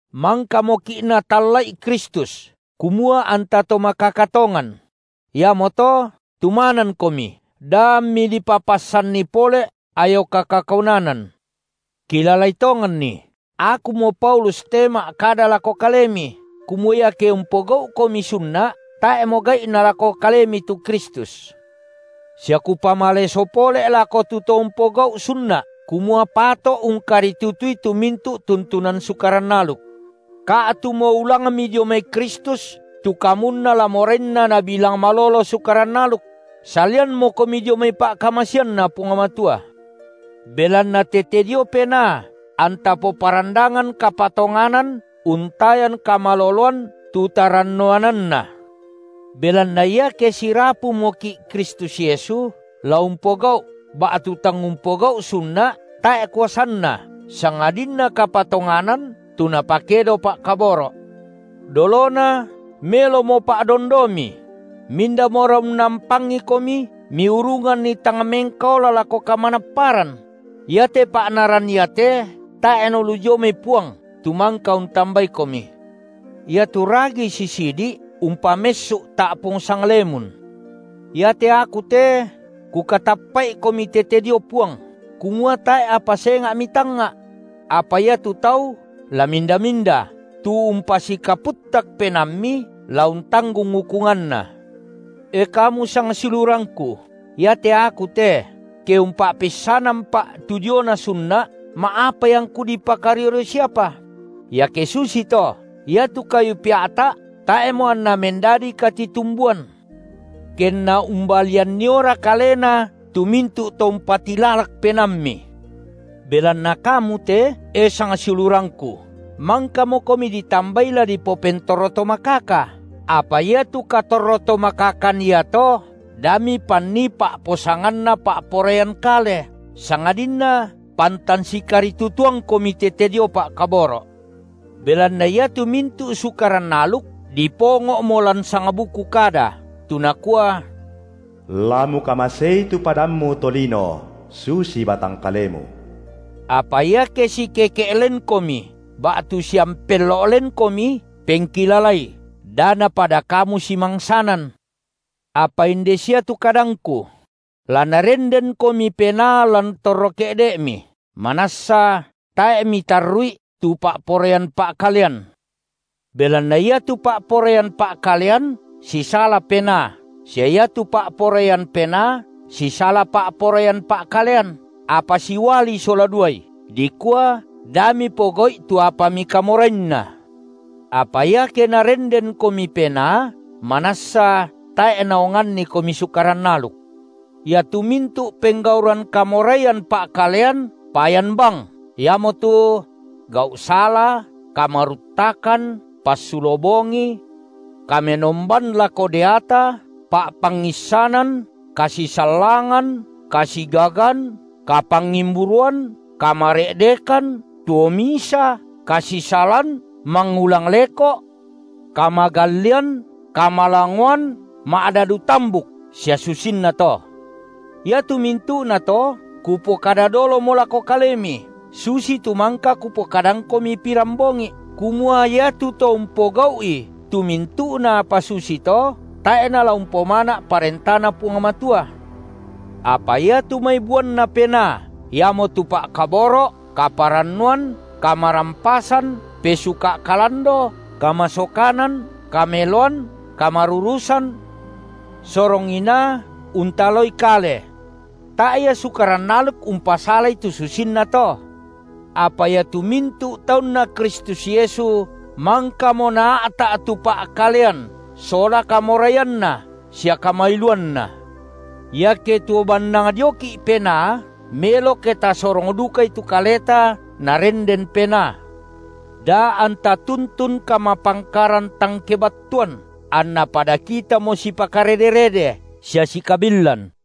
Mangkamoki’ Natalla’i Kristus kumua anta to makaka tongan; iamoto tumanankomi, da ammi dipapassanni pole’ ayoka kakaunanan. Kilalai tonganni, akumo Paulus te ma’kada lako kalemi, kumua iake umpogau’komi sunna’, tae’mo gai’na lako kalemi tu Kristus. Sia kupamaleso pole’ lako tu to umpogau’ sunna’, kumua pato’ ungkaritutui tu mintu’ tuntunan Sukaran aluk. Ka’tumo ulangmi dio mai Kristus tu kamunna la morainna nabilang malolo Sukaran aluk; salianmokomi dio mai pa’kamaseanNa Puang Matua. Belanna tete dio Penaa anta poparandangan kapatonganan untayan kamaloloan tu tarannuananna. Belanna iake sirapumoki’ Kristus Yesu, la umpogau’ ba’tu tang umpogau’ sunna’, tae’ kuasanna, sangadinna kapatonganan tu napakedo pa’kaboro’. Dolona melomo pa’dondomi; mindamora unnampangikomi miurunganni tang mengkaola lako kamanapparan? Iate pa’naran iate tae’ nalu dio mai Puang tu mangka untambaikomi. Iatu ragi sisidi’, umpamessu’ ta’pung sanglemun. Iate aku te kukatappa’ikomi tete dio Puang, kumua tae’ apa senga’ mitangnga’; apa iatu tau, la minda-minda, tu umpasikaputtak penaammi, la untanggung ukunganna. E kamu sangsiulurangku, iate aku te, ke umpa’peissanampa’ tu diona sunna’, ma’apai angku dipakario-rio siapa? Iake susito, iatu kayu pea’ta’ tae’mo anna mendadi katitumbuan. Kenna umbalianniora kalena tu mintu’ to umpatilalak penaammi. Belanna kamu te, e sangsiulurangku, mangkamokomi ditambai la dipopentorro to makaka, apa iatu katorro-tomakakan iato da mipannii pa’posanganna pa’poraian kale, sangadinna pantan sikaritutuangkomi tete dio pa’kaboro’. Belanna iatu mintu’ Sukaran aluk dipongo’mo lan sangbuku kada, tu nakua: La mukamasei tu padammu to lino, susi batang kalemu. Apa iake sikeke’ lenkomi ba’tu siampello’ lenkomi, pengkilalai da napada kamu simangsanan. Apa inde sia tu kadangku: La Narendenkomi Penaa lan torro ke’de’mi, manassa tae’ mitarru’i tu pa’poraian pa’kalean. Belanna iatu pa’poraian pa’kalean sisala Penaa, sia iatu pa’poraian Penaa sisala pa’poraian pa’kalean, apa siuali sola duai, dikua da mipogau’i tu apa mikamorainna. Apa iake Narendenkomi Penaa, manassa tae’ naongannikomi Sukaran aluk. Iatu mintu’ penggauran kamoraian pa’kalean payan bang, iamotu: gau’ sala, kamaruttakan, passulo bongi, kamenomban lako deata, pa’pangissanan, kasisallangan, kasigagan, kapangimburuan, kamare’dekan, tuo misa, kasisalan, mangulang leko’, kamagallian, kamalangoan, ma’dadu tambuk sia susinnato. Iatu mintu’nato kupokada dolomo lako kalemi, susitu mangka kupokadangkomi pirambongi’, kumua iatu to umpogau’i tu mintu’na apa susito, tae’ nala umpomana’ ParentaNa Puang Matua. Apa iatu mai buanNa Penaa, iamotu pa’kaboro’, kaparannuan, kamarampasan, pesuka’ kalando, kamasokanan, kameloan, kamarurusan, sorong inaa, untaloi kale. Tae’ ia sukaran aluk umpasalai tu susinna to. Apa iatu mintu’ taunNa Kristus Yesu mangkamo naa’ta’ tu pa’kalean sola kamoraianna sia kamailuanna. Iake tuo bannang dioki’ Penaa, melo ke tasorong dukai tu kaleta Narenden Penaa. Da anta tuntun kamapangkaran tang kebattuan, anna pada kitamo sipakarede-rede, sia sikabillan.